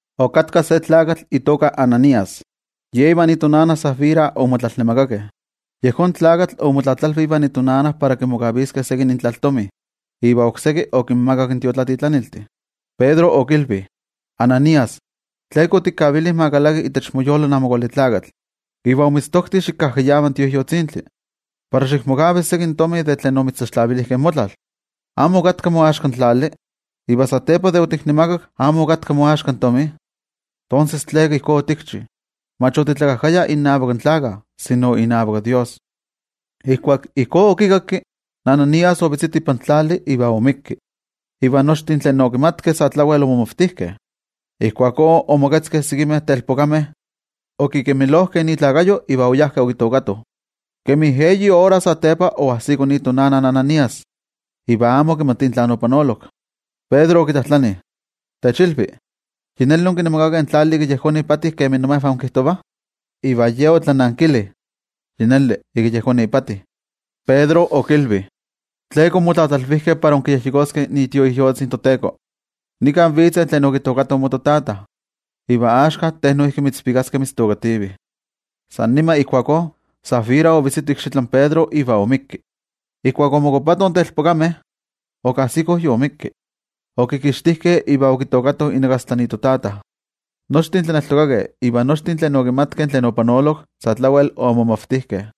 Okatka se tlakatl itoka Ananías, ye ivan itonana Safira omotlalnemakakeh. Yejón tlakatl omotlatlalvi ivan itonana para kimokaviskeh seki intlaltomi iva okseki okinmakak in tiotlatitlaniltih. Pedro okilvi: —Ananías, ¿tleka otikavili ma kalaki itech moyolo in Amo Kuali Tlakatl, iva omitztokti xikajkayava in Tioijyotzintli, para xikmokavi seki tomi de tlen omitztlaxtlavilijkeh in motlal? ¿Amo okatka moaxka in tlali? Iva satepa de otiknemakak, ¿amo okatka moaxka in tomi? Tonses, ¿tleka ijkó otikchi? Mach otitlakajkaya innavak in tlakah, sino inavak toYejwatzi. Ijkuak ijkó okikakki, Ananías ovetzito ipan tlali iva oixpolivik. Iva nochtin tlen okimatkeh sa tlawel omomavtijkeh. Ijkuakó omoketzkeh sekimeh telpokameh, okikemilojkeh ikuerpo iva oyajkeh okitookatoh. Kemi eyi ora satepa oajsiko itonana in Ananías, iva amo okimatia tlan opanolok. Pedro okitlajtlani: —Techilvi, ¿yi neli onkinemakakeh in tlali ika yejón ipati kemi imejvah inkijtovah? Iva ye otlanankili: —Yi neli, ika yejón ipati. Pedro okilvi: —¿Tleka onmotlatlalvijkeh para inkiyejyekoskeh iTioijyotzi in toTeko? Nika vitzeh tlen okitookatoh mototata, iva axka te noijki mitzvikaskeh mitztookativih. San nima ijkuakó Safira ovetzito ikxitlan Pedro iva oixpolivik. Ijkuak omokuapatoh in telpokameh, okajsikoh yoixpolivik. Okikixtijkeh iva okitookatoh inakastla itotata. Nochtin tlaneltokakeh iva nochtin tlen okimatkeh tlen opanolok, sa tlawel omomavtijkeh.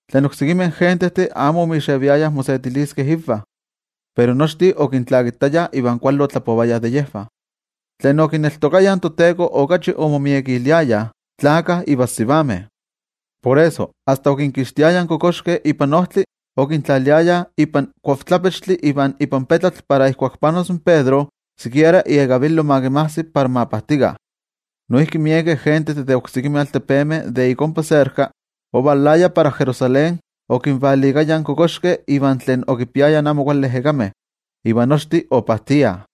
Tlen oksekimeh gentejtih amo omixeviayah mosetiliskeh invah, pero nochtin okintlakitayah iva kuali otlapovayah de yejvah. Tlen okineltokayah toTeko okachi omomiekiliayah, tlakah ivan sivameh. Por eso, asta okinkixtiayah in kokoxkeh ipan ojtli, okintlaliayah ipan kuavtlapechtli iva ipan petlatl para ijkuak panos in Pedro, sikiera iekavilo ma kinmajsi para ma pajtikah. Noijki miekeh gentejtih de oksekimeh altepemeh de ik ompa serka, ovalayah para Jerusalén okinvalikayah kokoxkeh iva tlen okipiayah amo kuali ejekameh, iva nochtin opajtiah.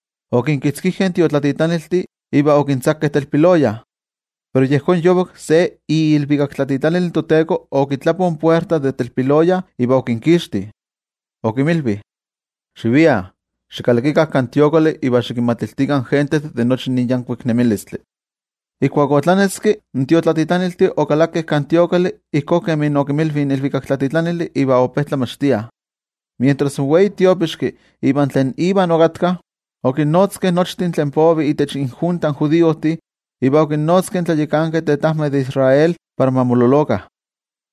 Okinkitzkijkeh in tiotlatitlaniltih iva okintzakeh telpiloya. Pero yejón yovak, se iilvikaktlatitlanil in toTeko okitlapo in puerta de telpiloya iva okinkixti. Okinmilvi: —Xiviah. Xikalakikah kan templo iva xikinmatiltikah in gentejtih de nochi nin yankuik nemilistli. Ijkuak otlaneski, in tiotlatitlaniltih okalakeh kan templo ijkó kemi okinmilvi in ilvikaktlatitlanili, iva ope tlamachtiah. Mientras in wei tiopixki iva tlen iva okatkah, okinnotzkeh nochtin tlen povih itech injunta in judiojtih iva okinnotzkeh in tlayakankeh tetajmeh de Israel para ma mololokah.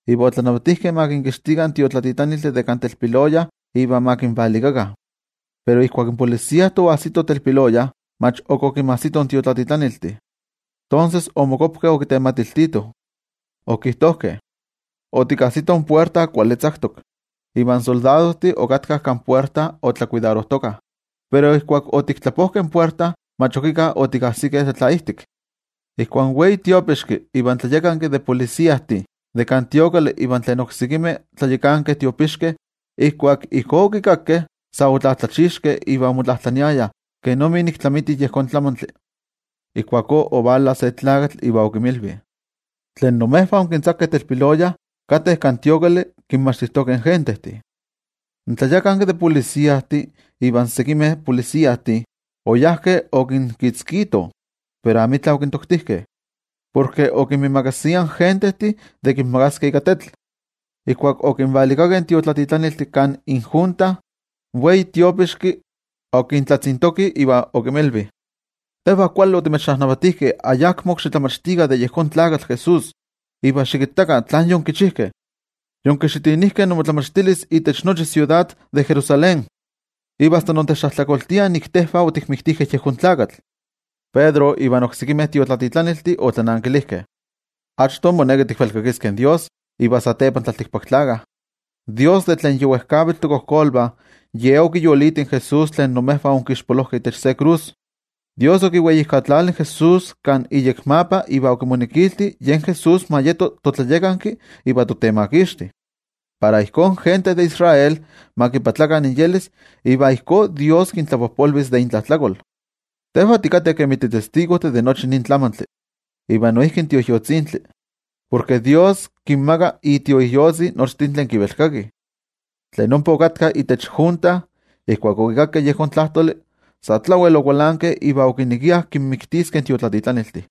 Iva otlanavatijkeh ma kinkixtitih in tiotlatitlaniltih de kan telpiloya iva ma kinvalikakah. Pero ijkuak in templojmayoltih oajsitoh telpiloya, mach ok okinmajsitoh in tiotlatitlaniltih. Tonses omokuapkeh okitematiltitoh, okijtojkeh: —Otikajsitoh in puerta kuali tzaktok, iva in soldadojtih okatkah kan puerta otlakuidarojtokah. Pero ijkuak otiktlapojkeh in puerta, mach ok íkka otikajsikeh tlatlaijtik. Ijkuak in wei tiopixki iva in tlayakanki de templojmayoltih ivan tlen oksekimeh tlayakankeh tiopixkeh ijkuak ijkó okikakkeh, sa otlatlachixkeh iva omotlajtlaniayah kenomi nik tlamiti nin tlamantli. Ijkuakó ovala se tlakatl, iva okinmilvi: —Tlen imejvah onkintzakeh telpiloya, kateh kan templo kinmachtijtokeh in gentejtih. In tlayakanki de templojmayoltih ivan sekimeh mayoltih, oyajkeh okinkitzkitoh, pero amitla okintoktijkeh, porke okinmiimakasiah in gentejtih de kinmagaskeh ika tetl. Ijkuak okinvalikakeh in tiotlatitlaniltih kan injunta, in wei tiopixki okintlatzintoki okinmilvi: —Tejvah kuali otimechnavatijkeh ayakmo xitlamachtikah de yejón tlakatl Jesús. Iva xikittakah tlan yonkichijkeh, yonkixitinijkeh inmotlamachtilis itech nochi in siudad de Jerusalén, iva asta intechtlajtlakoltiah nik tejvah otikmiktijkeh yejón tlakatl. Pedro ivan oksekimeh tiotlatitlaniltih otlanankilijkeh: —Achto moneki tikvelkakiskeh in toYejwatzi, iva satepa in tlaltikpaktlakah. In toYejwatzi de tlen yi wejkavitl tokojkolvah Ye okiyoliti in Jesús tlen imejvah onkixpolojkeh itech se krus. In toYejwatzi okiweijkatlali in Jesús kan iyekmapa iva okimonekilti yen Jesús ma yeto toTlayakanki iva toTemakixti, para ijkó in gente de Israel ma moyolkuapakah iva ijkó toYejwatzi kintlapojpolvis de intlajtlakol. Tejvah tikateh kemi titestigojtih de nochi nin tlamantli, iva noijki in Tioijyotzintli. Porke toYejwatzi kinmaka iTioijyotzi nochtin tlen kivelkakih. Tlen ompa okatkah itech junta, ijkuak okikakkeh yejón tlajtoli, sa tlawel okualankeh iva okinekiah kinmiktiskeh in tiotlatitlaniltih.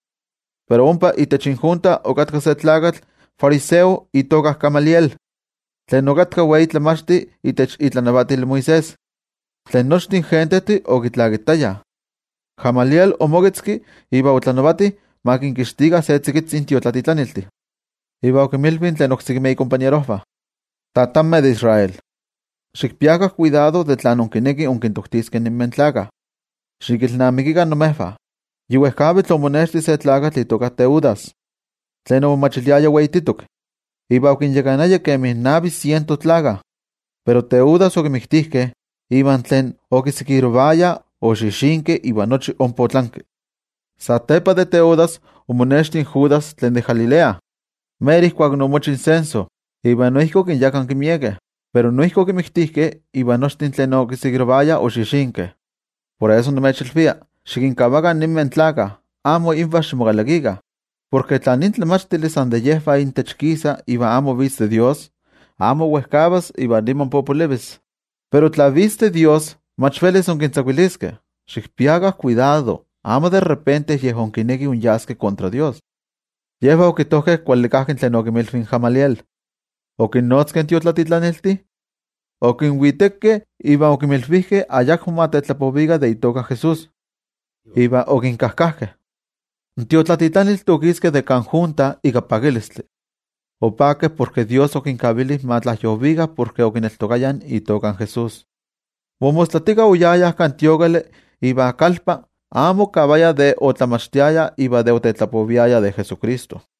Pero ompa itech injunta okatka se tlakatl fariseo itoka Gamaliel, tlen okatka wei tlamachti itech itlanavatil Moisés, tlen nochtin gentejtih okitlakitayah. Gamaliel omoketzki iva otlanavati ma kinkixtikah se tzikitzi in tiotlatitlaniltih. Iva okinmilvi tlen oksekimeh ikompañerojvah: —Tatanmeh de Israel, xikpiakah kuidado de tlen inkinekih inkintoktiskeh ninmeh tlakah. Xikilnamikikah imejvah, yi wejkavitl omonexti se tlakatl itoka Teudas, tlen omomachiliaya weititok, iva okinyakanaya kemi navi siento tlakah. Pero Teudas okimiktijkeh, iva tlen okitokayah oxixinkeh iva nochi ompa otlanki. Satepa de Teudas omonexti Judas tlen de Galilea, mero ijkuak omochi censo, iva noijki okinyakanki miekeh, pero noijki okimiktijkeh, iva nochtin tlen okitokayah oxixinkeh. Por eso nimechilvia: xikinkavakah ninmeh tlakah, amo invah ximokalakikah. Porke tla nin tlamachtili san de yejvah intech kisa iva amo vitz de Dios, amo wejkavas iva niman popolivis. Pero tla vitz de Dios, mach velis inkitzakuiliskeh. Xikpiakah kuidado, amo san kichiva yej inkinekih inmokitzkiskeh ivan Dios. Yejvah okijtojkeh kuali kajki tlen okinmilvi in Gamaliel. Okinnotzkeh in tiotlatitlaniltih, okinwitekeh iva okinmilvijkeh ayakmo ma tetlapovikah de itoka in Jesús, iva okinkajkajkeh. In tiotlatitlaniltih okiskeh de kan junta ika pakilistli, opakeh porke Dios okinkavili ma tlajyovikah por okineltokayah itoka in Jesús. Momostlatika oyayah kan templo iva kalpa, amo okavayah de otlamachtiayah iva de otetlapoviayah de Jesucristo.